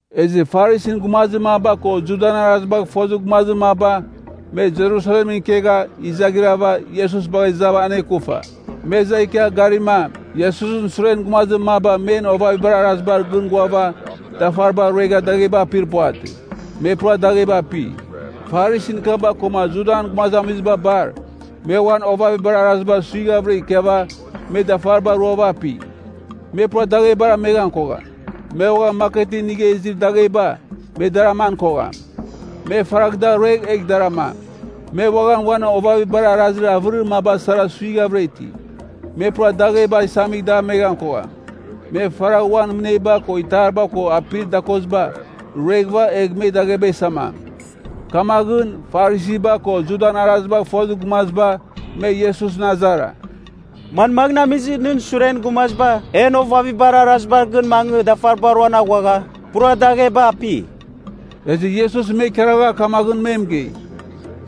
Ezɨ Farisin gumazir maba ko Judan arazibagh fozir gumazir maba, me Jerusalemɨn ikegha, izaghrava, Iesus bagha izava anekufa. Me iza ikia garima, Iesusɨn suren gumazir maba men ovavibar arazibar gɨn ghuava dafariba ruegha dagheba apir puvatɨ. Me pura dagheba api. Farisin kaba koma Judan gumazamiziba bar, me uan ovavibar arazibar suighavɨra ikiava, me dafariba ruava api. Me pura daghebar aman kogham. Me uaghan maketɨn inigha izir dagheba, me dar aman kogham. Me faragh da ruegh egh dar amam. Me uaghan uan ovavibar arazir avɨrir maba sara suiraghavɨra iti. Me pura dagheba isamigh dameghan kogham. Me faragh uan mɨneba ko itariba ko apir dakoziba, rueghɨva egh me dagheba isamam. Kamaghɨn, Farisiba ko Judan arazibagh fozir gumaziba, me Iesusɨn azara, “Manmaghɨn amizɨ nɨn suren gumaziba en ovavibar arazibar gɨn mangɨ dafariba ruan aghuagha, pura dagheba api?” Ezɨ Iesus me ikaragha kamaghɨn mɨgei,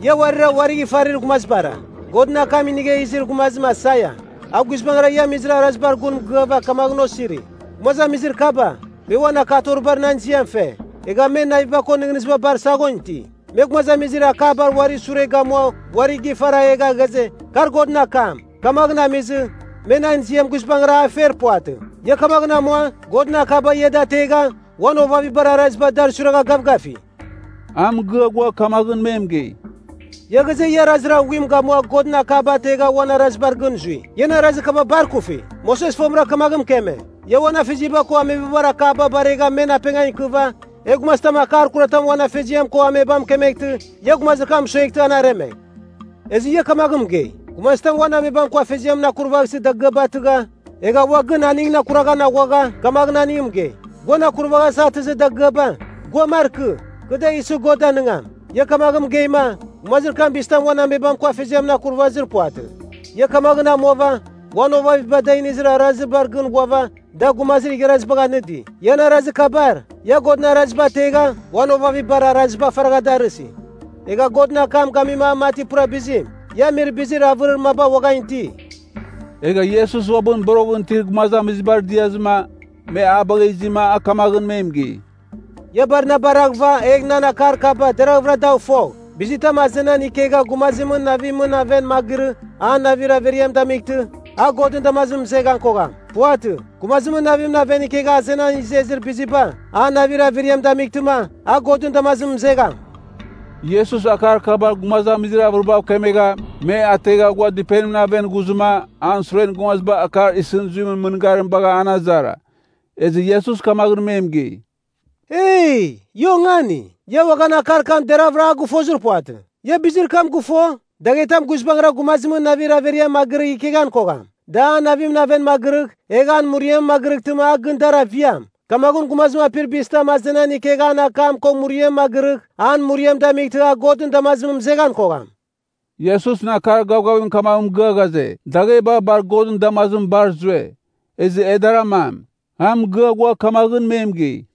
“Ia uarira uarigh ifarir gumazibara. Godɨn akam inigha izir gumazim Aisaia, a guizbangɨra ia amir arazibar gun mɨgɨava kamaghɨn osiri, ‘Gumazamizir kaba, me uan akatoribar nan ziam fe, egha men naviba ko nɨghnɨziba bar saghon iti. Me gumazibar akabar uari sure gamua uari gifara egha ghaze, kar Godɨn akam. Kamaghɨn amizɨ, me nan ziam guizbangɨra a fer puvatɨ.’ Ia kamaghɨn amua, Godɨn akaba, ia da ategha, uan ovavibar araziba, dar suiragha gavgafi.” A mɨgɨa ghua kamaghɨn me mɨgei, “Ia ghaze, ia arazir aghuim gamua Godɨn akaba ategha uan arazibar gɨn zui. Ian arazir kaba bar ikufi. Moses fomɨra kamaghɨn mɨkeme, ‘Ia uan afeziaba ko amebabar akaba baregh men apengan ikɨva, egh gumazitam akar kuratam uan afeziam ko amebam mɨkemeghtɨ, ia gumazir kam mɨsueghtɨ, an aremegh.’ Ezɨ ia kamaghɨn mɨgei, ‘Gumazitam uan amebam ko afeziamɨn akurvaghsɨ dagɨaba atɨgha, egha ua gɨn aningɨn akuraghan aghuagha, kamaghɨn aning mɨgei, “Guan akuraghasa atɨzir dagɨaba, gua markɨ. Kɨ da isɨ God danɨngam.” ’ Ia kamaghɨn mɨgeima, gumazir kam bizitam uan amebam ko afeziamɨn akuravazir puvatɨ. Ia kamaghɨn amuava, uan ovaviba da inizir arazibar gɨn ghuava, da gumazir igharazibagh anɨdi. Ian arazir kabar, ia Godɨn araziba ategha, uan ovavibar araziba faragha darɨsi. Egha Godɨn akam gami a mati pura bizim. Ia amir bizir avɨrir maba uaghan iti.” Egha Iesus ua uabɨn boroghɨn itir gumazamizibar diazɨma, me a bagha izima, a kamaghɨn me mɨgei, “Ia bar na baraghɨva egh nan akar kaba, deraghvɨra dagh fogh. Bizitam azenan ikegha gumazimɨn navimɨn aven magirɨ an navir averiam damightɨ, a Godɨn damazimɨn mɨzeghan kogham. puvatɨ, gumazimɨn navimɨn aven ikegha azenan izezir biziba, an navir averiam damightɨma, a Godɨn damazimɨn mɨzegham.” Iesus akar kaba gumazamizir avɨribav kemegha, me ategha ghua dɨpenimɨn aven ghuzɨma, an suren gumaziba akar isɨn zuimɨn mɨngarim bagha an azara. Ezɨ Iesus kamaghɨn me mɨgei, “Eee! Ia ongani? Ia uaghan akar kam deravɨra a gɨfozir puvatɨ? Ia bizir kam gɨfo? Daghetam guizbangɨra gumazimɨn navir averiamɨn magɨrɨgh ikeghan kogham. Da an navimɨn aven magɨrɨgh, egh an muriamɨn magɨrɨghtɨma a gɨn dar aviam. Kamaghɨn gumazim apir bizitam azenan ikegh an akam ko muriamɨn magɨrɨgh, an muriam damightɨma a Godɨn damazimɨn mɨzeghan kogham.” (Iesusɨn akar gavgavim kamaghɨn mɨgɨa ghaze, dagheba bar Godɨn damazimɨn bar zue. Ezɨ e dar amam.) A mɨgɨa ghua kamaghɨn me mɨgei,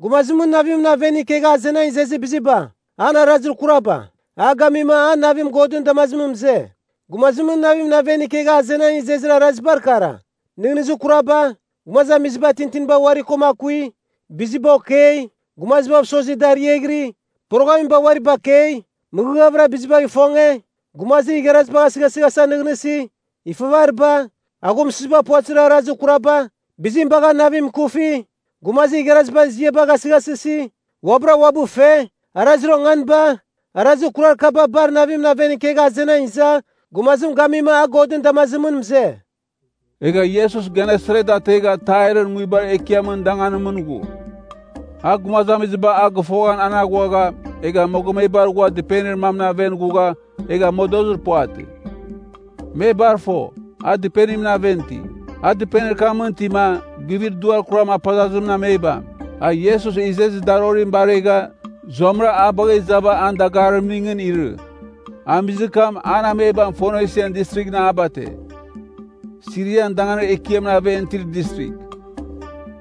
“Gumazimɨn navimɨn aven ikegha azenan izezir biziba, an arazir kuraba, a gamima, an navim Godɨn damazimɨn mɨze. Gumazimɨn navimɨn aven ikegha azenan izezir arazibar kara, nɨghnɨzir kuraba, gumazamiziba tintinba uari koma akui, biziba okei, gumazibav mɨsozi da ariaghɨri, poroghamiba uari bakei, mɨghɨvɨra bizibagh ifonge, gumazir igharazibagh asɨghasɨghasa nɨghnɨsi, ifavariba, aghumsɨziba puvatɨzir arazir kuraba, bizim bagha navim ikufi, gumazir igharazimɨn ziam gasɨghasɨsi, uabɨra uabɨ fe, arazir onganiba, arazir kurar kaba bar navimɨn aven ikegha azenan iza, gumazim gamima a Godɨn damazimɨn mɨze.” Egha Iesus Genesaret ategha Tairɨn nguibar ekiamɨn danganimɨn ghu. A gumazamiziba a gɨfoghan an aghuagha, egha mogomebar ghua dɨpenir mamɨn aven ghugha egha modozir puvatɨ. Me bar fo, a dɨpenimɨn aven iti. A dɨpenir kamɨn itima, guivir duar kuram apazazimɨn amebam, a Iesus izezir darorim baregha, zuamɨra a bagha izava an dagarimning irɨ. Amizir kam, an amebam Fonisian Distrighɨn a bate. Sirian danganir ekiamɨn aven itir distrigh.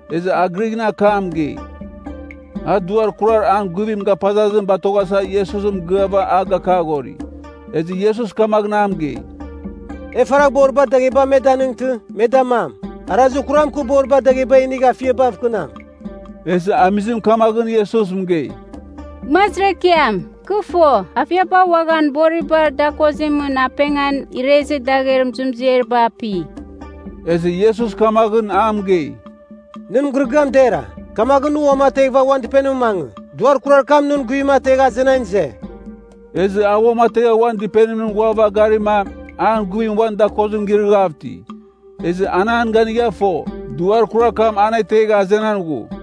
Ezɨ a Grighɨn akamɨn mɨgei. A duar kurar an guivim gapazazim batoghasa Iesus mɨgɨava a gakaghori. Ezɨ Iesus kamaghɨn a mɨgei, “E faragh boribar dagheba me danɨngtɨ, me damam. Arazir kuram, kɨ boribar dagheba inigh afiabav kɨnam.” Ezɨ amizim kamaghɨn Iesus mɨgei, “Gumazir Ekiam, kɨ fo, afiaba uaghan boribar dakozimɨn apengan irezir dagher muzuemziariba api.” Ezɨ Iesus kamaghɨn a mɨgei, “Nɨn mɨgɨrɨgɨam dera. Kamaghɨn nɨ uamateghɨva uan dɨpenimɨn mangɨ. Duar kurar kam nɨn guivim ategha azenan ize.” Ezɨ a uamategha uan dɨpenimɨn ghuava garima, an guivim uan dakozim girɨghav iti. Ezɨ an an ganigha fo, duar kurar kam an ategha azenan ghu.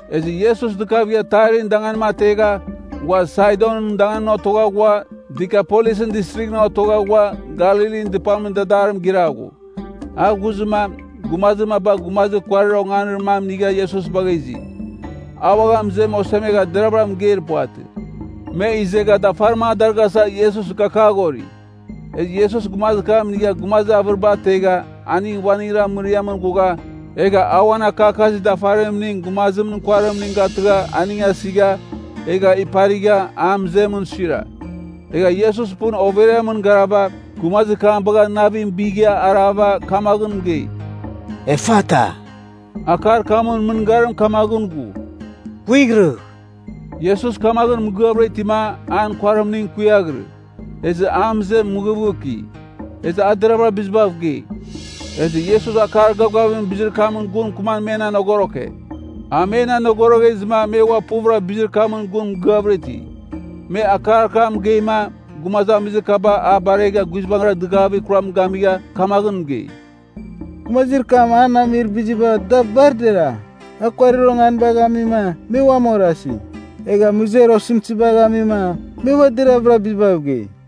Ezɨ Iesus dɨkavigha Tairɨn danganim ategha, ghua Saidonɨn danganimɨn otogha ghua, Dikapolisɨn Distrighɨn otogha ghua, Galilin dɨpamɨn dadarim giraghu. A ghuzɨma, gumazir maba gumazir kuarir onganir mam inigha Iesus bagha izi. A uaghan mɨzem osemegha deravɨra mɨgeir puvatɨ. Me izegha dafarim a darɨghasa Iesus gakaghori. Ezɨ Iesus gumazir kam inigha gumazir avɨriba ategha aning uaningra mɨriamɨn ghugha, egha a uan akakazir dafarimning gumazimɨn kuarimning gatɨgha aning asigha, egha iparigha, an mɨzemɨn suira. Egha Iesus pɨn overiamɨn garava, gumazir kam bagha navim bigha arava kamaghɨn mɨgei, “Efata!” (Akar kamɨn mɨngarim kamaghɨn ghu, “Kuighrɨgh!”) Iesus kamaghɨn mɨgɨavɨra itima, an kuarimning kuiaghirɨ. Ezɨ an mɨzem mɨghɨvghɨki. Ezɨ a deravɨra bizibav gei. Ezɨ Iesus akar gavgavimɨn bizir kamɨn gun mɨkɨman men anogoroke. A men anogoroghezɨma me ua puvɨrama bizir kamɨn gun mɨgɨavɨra iti. Me akar kam mɨgeima, gumazamizir kaba a baregha guizbangɨra dɨgavir kuram gamigha kamaghɨn mɨgei, “Gumazir kam an amir biziba da bar dera. A kuarir onganibagh amima, me uam orasi. Egha, mɨzer osɨmtɨzibagh amima, me ua deravɨra bizibav gei.”